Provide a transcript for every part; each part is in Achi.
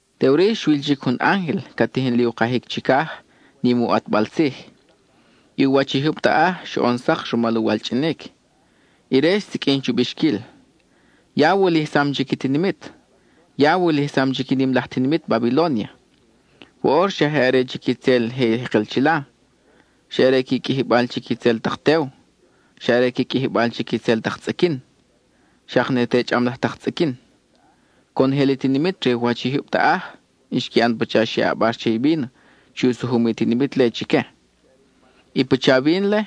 Teʼuri xwil chic jun ángel ca tijin li u kajic chicaj, nim i u ʼatbal tzij. I u wach i jyub taʼaj xoʼon sak rumal u walchʼinic. Ire xsiqʼuin chu bixquil: —¡Ya wulijsam chic i tinimit; ya wulijsam chic i nim laj tinimit Babilónia! Woʼor xa je are chic itzel je jekel chila, xa are qui qʼuijibal chic itzel tak tew, xa are qui qʼuijibal chic i itzel tak tzʼiquin, xak ne te chʼam laj tak tzʼiquin. Conojel i tinimit re u wach i jyub taʼaj xqui ʼan pacha xe ʼabar che i víno chi u sujum i tinimit-le chique; i pacha vin-le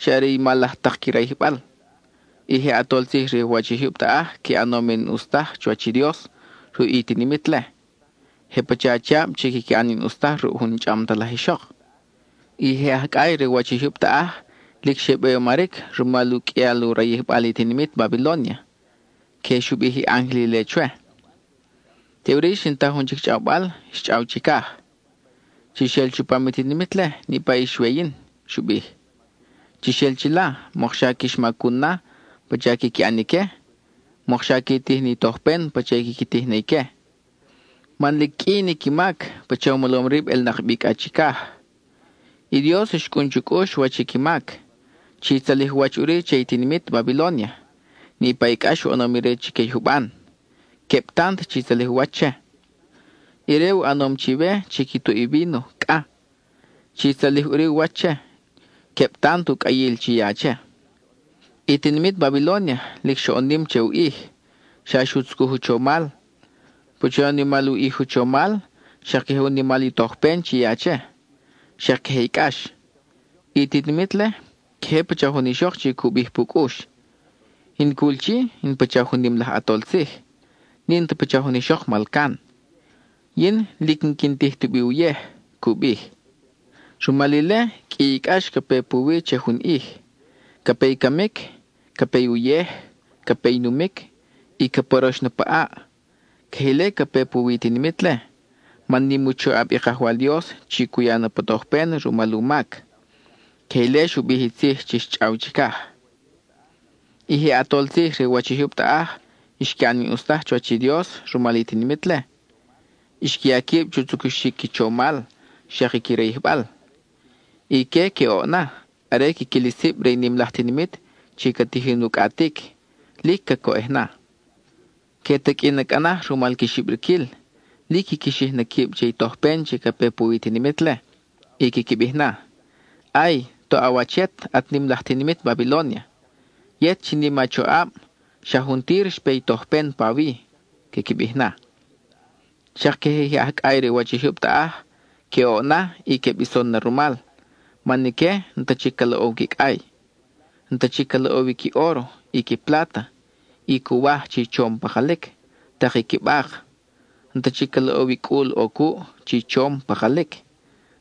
xa are i mal laj tak qui rayijbal. I je ʼatol tzij re u wach i jyub taʼaj qui ʼanom i n-ʼus taj chuwach i Dios ruʼ i tinimit-le; je pacha achiab chi quiqui ʼan i n-ʼus taj ruʼ jun n-chʼam ta laj ixok. I je aj cʼay re u wach i jyub taʼaj lic xe beyomaric rumal u qʼuial u rayijbal i tinimit Babilónia. (Queje xu bij i ángel ile chwe.) Teʼuri xin ta jun chic chʼawbal xchʼaw chicaj: —Chix el chupam i tinimit-le, niʼpa ix we yin —xu bij—. Chix el chila, mokxa quix macun na pacha quiqui ʼan ique, mokxa qui tij ni tojpen pacha i quiqui tij na ique. Man lic qʼui ni qui mac, pacha u molom rib ʼelnak bi cʼa chicaj. I Dios, xcʼun chu cʼux wach i qui mac. Chi tzalij u wach ʼuri che i tinimit Babilónia, niʼpa i cʼax u ʼanom ire chique i juban; queb tant chi tzalij u wach che. Ire u ʼanom chiwe chi qui tuʼ i víno cʼa; chi tzalij ʼuri u wach che, queb tant u cʼayil chi ya che. I tinimit Babilónia lic xoʼon nim che u ʼij; xa xu tzucuj u chomal. Pacha u nimal u ʼij u chomal, xak queje u nimal i tojpen chi ya che, xak queje i cʼax. I tinimit-le, queje pacha jun ixok chi cu bij pu cʼux: “In cul chi, in pacha jun nim laj ʼatol tzij; n-in ta pacha jun ixok malcan; yin lic n-quin tij tubi uyej,” cu bij. Rumal ile, qʼui i cʼax ca pe puwi che jun ʼij. Ca pe i camic, ca pe i uyej, ca pe i numic, y ca porox na pa ʼaʼ. Queje ile ca pe puwi i tinimit-le, man nim u choʼab i Kajwal Dios chi cu ya na pa tojpen rumal u mac. (Queje ile xu bij i tzij chi xchʼaw chicaj.) I je ʼatol tzij re u wach i jyub taʼaj xqui ʼan i n-ʼus taj chuwach i Dios rumal i tinimit-le; xqui ya quib chu tzucuxic qui chomal xak i qui rayijbal. Ique que oʼ na are quiquil i sib re i nim laj tinimit chi ca tijin u cʼatic; lic cacoʼej na. Que taqʼui na cʼa naj rumal qui xibriquil; lic quiqui xij na quib che i tojpen chi ca pe puwi i tinimit-le, y quiqui bij na: —¡Ay, toʼ a wach yet, at nim laj tinimit Babilónia! ¡Yet chi nim a choʼab, xa juntir xpe i tojpen pawi! —quiqui bij na. Xak queje i je aj cʼay re u wach i jyub taʼaj, que oʼ na y que bison na rumal, man ique n-ta chic ca loʼow qui cʼay. N-ta chic ca loʼow i qui óro, i qui pláta, i cuwaj chi chom pakalic, tak i qui bak. N-ta chic ca loʼow i cʼul ʼo cuʼ chi chom, pakalic.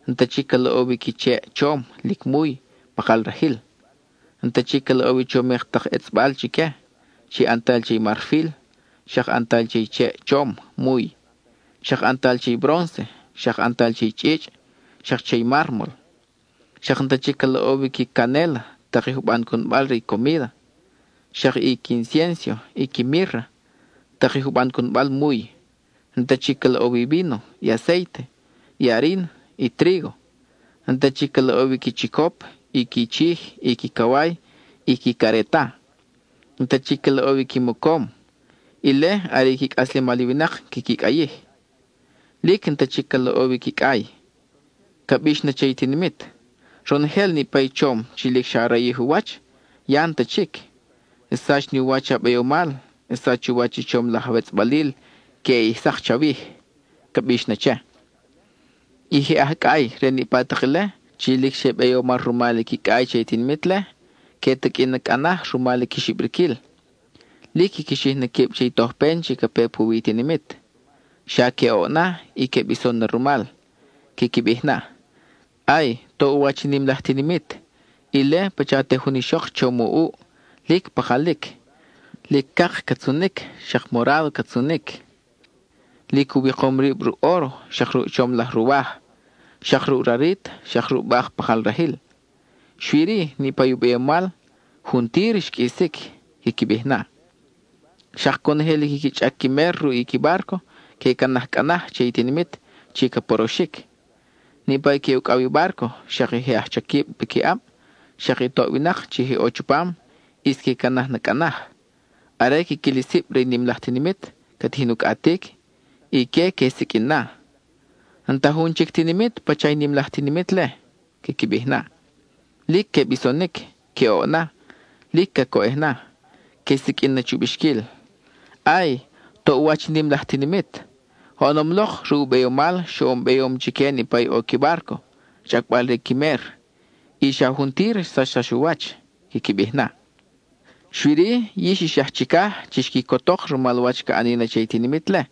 N-ta chic ca loʼow i qui cheʼ chom, lic muy, pakal rajil. N-ta chic ca loʼow i chomik tak etzʼbal chique, chi ʼantal che i marfil, xak ʼantal che i cheʼ chom, muy; xak ʼantal che i brónce, xak ʼantal che i chʼichʼ, xak che i mármol. Xak n-ta chic ca loʼow i qui canéla, tak i juban cunbal re i comída, xak i qui inciénso, i qui mírra, tak i juban cunbal muy. N-ta chic ca loʼow i víno, i acéite, i arin, i trígo. N-ta chic ca loʼow i qui chicop, i qui chij, i qui caway, i qui careta. N-ta chic ca loʼow i qui mocom (ile are qui cʼaslemal i winak quiqui cʼayij.) Lic n-ta chic ca loʼow i qui cʼay. Ca bix na che i tinimit: —Ronojel niʼpa i chom chi lic xa rayij u wach, ya n-ta chic. Xsach ni u wach a beyomal, xsach u wach i chom laj awetzʼbalil queʼe ʼij sak chawij —ca bix na che. I je aj cʼay re niʼpa tak ile, chi lic xe beyomar rumal i qui cʼay che i tinimit-le, que taqʼui na cʼa naj rumal qui xibriquil; lic quiqui xij na quib che i tojpen chi ca pe puwi i tinimit. Xa que oʼ na y que bison na rumal. Quiqui bij na: —¡Ay, toʼ u wach i nim laj tinimit! Ile, pacha te jun ixok chom u ʼuʼ, lic pakalic; lic cak ca tzunic, xak morádo ca tzunic. Lic u wikom rib ruʼ óro, xak ruʼ chom laj ruwaj, xak ruʼ rarit, xak ruʼ bak pakal rajil. Xui-ri, niʼpa i u beyomal ¡juntir xqʼuisic! —quiqui bij na. Xak conojel i quiqui chʼac qui mer ruʼ qui bárco, que canaj cʼa naj che i tinimit chi ca poroxic; niʼpa i que ucʼaw i bárco, xak i je aj chaquib piquiʼab, xak i toʼ winak chi je ʼo chupam, ʼis que canaj na cʼa naj. Are quiquil i sib re i nim laj tinimit ca tijin u cʼatic, ique que siqʼuin na: —¡N-ta jun chic tinimit pacha i nim laj tinimit-le! —quiqui bij na. Lic que bisonic; que oʼ na, lic cacoʼej na. Que siqʼuin na chu bixquil: —¡Ay, toʼ u wach i nim laj tinimit! Oʼonom lok, ruʼ u beyomal xoʼon beyom chique niʼpa ʼo i qui bárco, chʼacbal re qui mer. Y xa juntir xsachsax u wach —quiqui bij na. Xui-ri, yix ix aj chicaj, chix quicotok rumal wach ca ʼani na che i tinimit-le.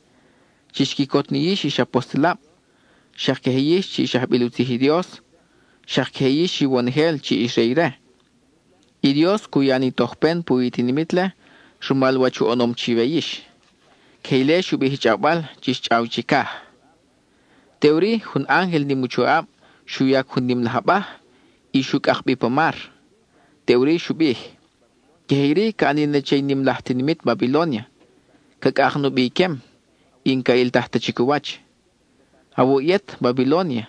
Chix quicot ni yix ix apostelab, xak queje yix chi ix ajbil u tzij i Dios, xak queje yix iwonojel chi ix re ire. I Dios cu ya ni tojpen puwi i tinimit-le rumal wach u ʼanom chiwe yix. (Queje ile xu bij i chʼawbal chi xchʼaw chicaj.) Teʼuri, jun ángel nim u choʼab xu yac jun nim laj abaj y xu cʼak bi pa mar. Teʼuri xu bij: —Queje iri ca ʼani na che i nim laj tinimit Babilónia; ca cʼak nubi iquem, y n-ca ʼiltaj ta chic u wach. Awuʼ yet, Babilónia,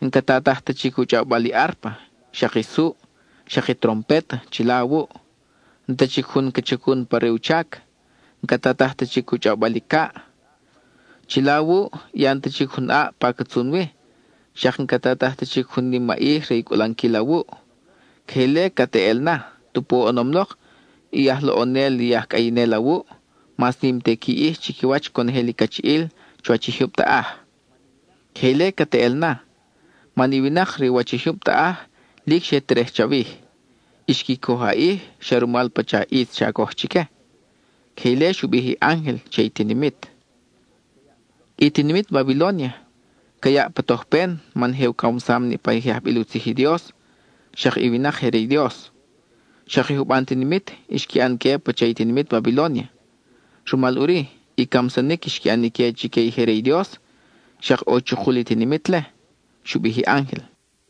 n-ca tataj ta chic i u chʼawbal i árpa, xak i suʼ, xak i trompet chila awuʼ; n-ta chic jun ca chacun pa re u chac; n-ca tataj ta chic u chʼawbal i caʼ. Chila awuʼ, ya n-ta chic jun ʼaʼ pa ca tzun wi, xak n-ca tataj ta chic jun nimaʼij re i cʼulanquil awuʼ. Queje ile cat eʼel na, tupu oʼonom lok i aj loʼonel i aj cʼayinel awuʼ mas nim te qui ʼij chiquiwach conojel i cachiʼil chuwach i jyub taʼaj. Queje ile cat eʼel na, man i winak re u wach i jyub taʼaj lic xe terej chawij; xqui coj a ʼij xa rumal pacha ʼitz xa coj chique. (Queje ile xu bij i ángel che i tinimit.) I tinimit Babilónia ca yaʼ pa tojpen man je u camsam niʼpa i je ajbil u tzij i Dios, xak i winak je re i Dios. Xak i juban tinimit xqui ʼan que pacha i tinimit Babilónia; rumal ʼuri, i camsanic xqui ʼan ique chique i je re i Dios, xak ʼo chukul i tinimit-le —xu bij i ángel.